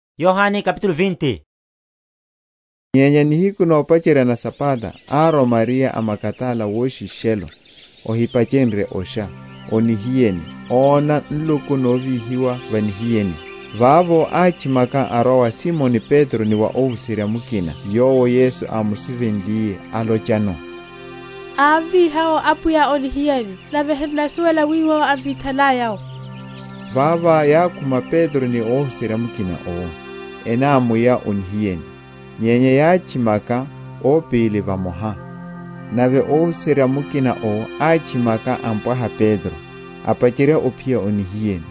Ovinya’tho wa Yesu. Nyenya nihiku nopacherya na Sabata árwa Mariya a Magadala woshishelo, ohipachenrye osha, o nihiyeni, óna nluku novíhiwa va nihiyeni. Vavo átchimaka arwa wa Simoni Petro ni wa óhuserya mukina yowo Yesu ámusivenliye, alochano, Ámviha’wo Apwiya o nihiyeni, nave han’nasuwela wiwo emvitha?-?laya’wo. Vavo yákhuma Petro ni óhuserya mukina owo, enámuya o nihiyeni. Nyenya yátchimaka ópili vamoha: nave óhuserya mukina owo átchimaka ampwaha Petro, apacherya ophiya o nihiyeni;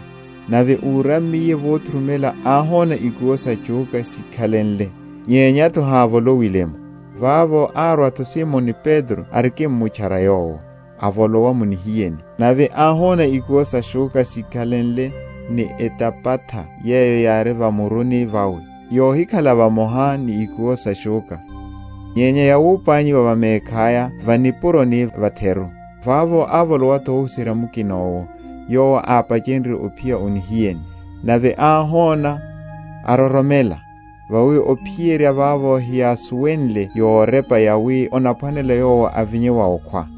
nave úrammiye vothurumela áhona ikuwo sa shúkha síkhalenle, nyenya’tho hávolowile’mo. Vavo árwa’tho Simoni Petro arikimmutchara yowo, avolowa mu nihiyeni; nave áhona ikuwo sa shúkha síkhalenle, ni etapatha yeyo yári va muruni vawe, yohikhala vamoha ni ikuwo sa shúkha, nyenya yawapanyiwa va mekhaya va nipuroni va’theru. Vavo ávolowa’tho óhuserya mukina owo, yowo ápachenrye ophiya o nihiyeni, nave áhona, aroromela. Vawi ophiyerya vavo heyásuwenle yorepa yawi anaphwanela Yowo ovinya wa okhwa.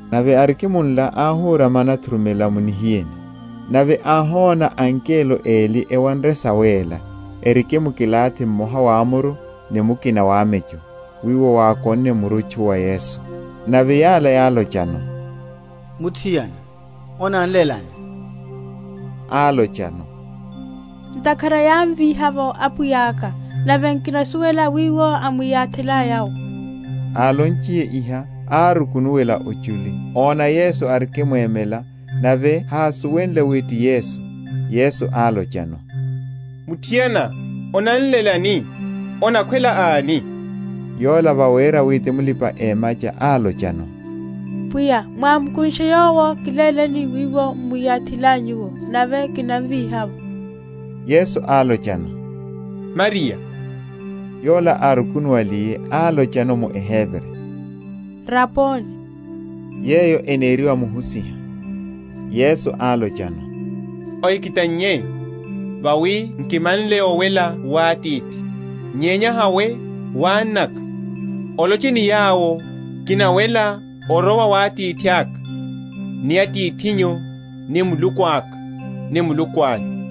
Nave arikimunla áhurama anathurumela mu nihiyeni; nave áhona angelo eli ewanre sawéla, erimkilathi mmoha wamuru, ni mukina wamecho, wiwo wákonne murutchu wa Yesu. Nave yala yálochano, Muthiana, onanlelani? Álochano, Ntakhara yávíha’vo Apwiya’ka, nave nkinasuwela wiwo emwiyathilaya’wo. Álonchiye iha, árukunuwela ochuli, óna Yesu arikimwemela, nave hásuwenle wi ti Yesu. Yesu álochano, Muthiana, onanlelani? onakhwela ani? Yola vawera wi ti mulipa‐emacha, álochano, Pwiya mwámukunshe Yowo, kiléleni wiwo m’mwiyathilanyu’wo, nave kinamvíha’wo. Yesu álochano, Mariya. Yola árukunuwaliye, álochano mu eHebri, Raboni; yeyo eneriwa, Muhusiha. Yesu álochano, Ohikitannye, vawi nkimanle owela wa Atithi: nyenya hawe wa annaka, oloche ni yawo, Kinawela, orowa wa Atithaka, ni Atithinyu, ni Muluku aka, ni Muluku anyu.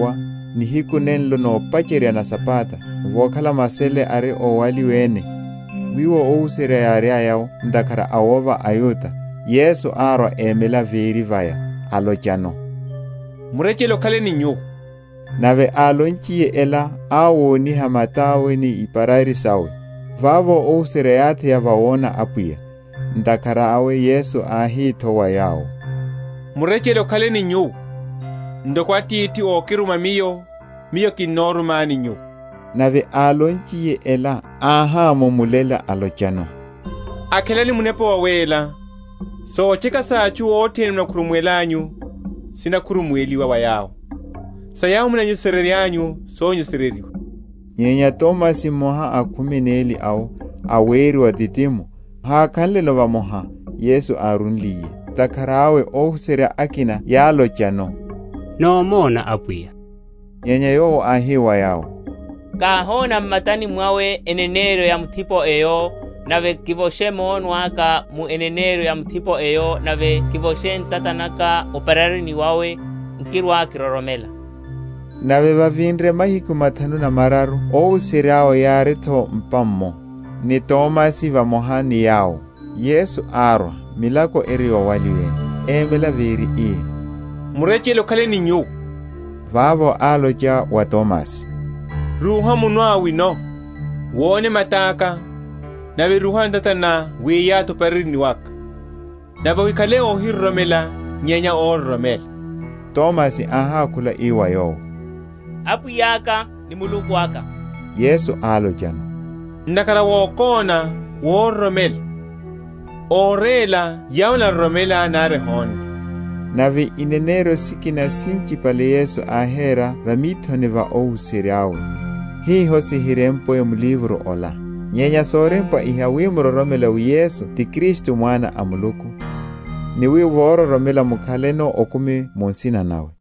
Vavo, vokhala oshekuwa, nihiku nenlo nopacherya na Sabata, vokhala masele ari ówaliwene, wiwo óhuserya yáriaya’wo, ntakhara a wova aYuda, Yesu árwa émela véri vaya, alochano, Murechele okhale ni nyuwo. Nave álonchiye ela, áwoniha mata’we ni iparari sawe. Vavo óhuserya yátheya vawona Apwiya. Ntakhara awe Yesu áhi’tho wa yawo, Murechele okhale ni nyuwo: ntoko Atithi ókiruma Miyo, Miyo kinorumani nyuwo. Nave álonchiye ela áhámumulela, alochano, Akhelani Munepa Wawéla. Sotcheka sa atchu othene munakhurumuwelanyu, sinakhurumuweliwa wa yawo; sa yawo munanyesereryanyu, sonyesereryiwa. Nyenya Tomasi, mmoha a khumi neli awo, aweriwa Didimo, hákhanleno vamoha, Yesu árúliye. Ntakhara awe óhuserya akina yálochano, Nómona Apwiya. Nyenya yowo áhi wa yawo, Káhona m’matani mwawe eneneryo ya mithipo eyo, nave kivoshe munwe aka mu eneneryo ya mithipo eyo, nave kivoshe ntata naka o’pararini wawe; nkirwa‐kiroromela. Nave vavinre mahiku mathanu na mararu óhuserya’we yári’tho m’pa’mmo, ni Tomasi vamoha ni yawo. Yesu árwa, milako eri yowaliwene, émela véri, ii, Murechele okhale ni nyuwo. Vavo álocha wa Tomasi, Rúha munwá wino, wone mata’ka; nave rúha ntata ná wiyathi o’pararini waka, nave ohikhale óhiroromela, nyenya óroromela. Tomasi áhákhula ii wa Yowo, Apwiya aka, ni Muluku aka. Yesu álochano, Ntakhara wokóna, wororomela; óréla yawo enaroromela, nari ehonne. Nave ineneryo sikina sinchipale Yesu áhera va mithoni va óhuserya’we, hiho sihirempwe m’livro ola: nyenya sorempwa iha wi muroromele wi Yesu ti Kristu Mwana a Muluku, ni wi vororomela mukhaleno okumi mu nsina nawe.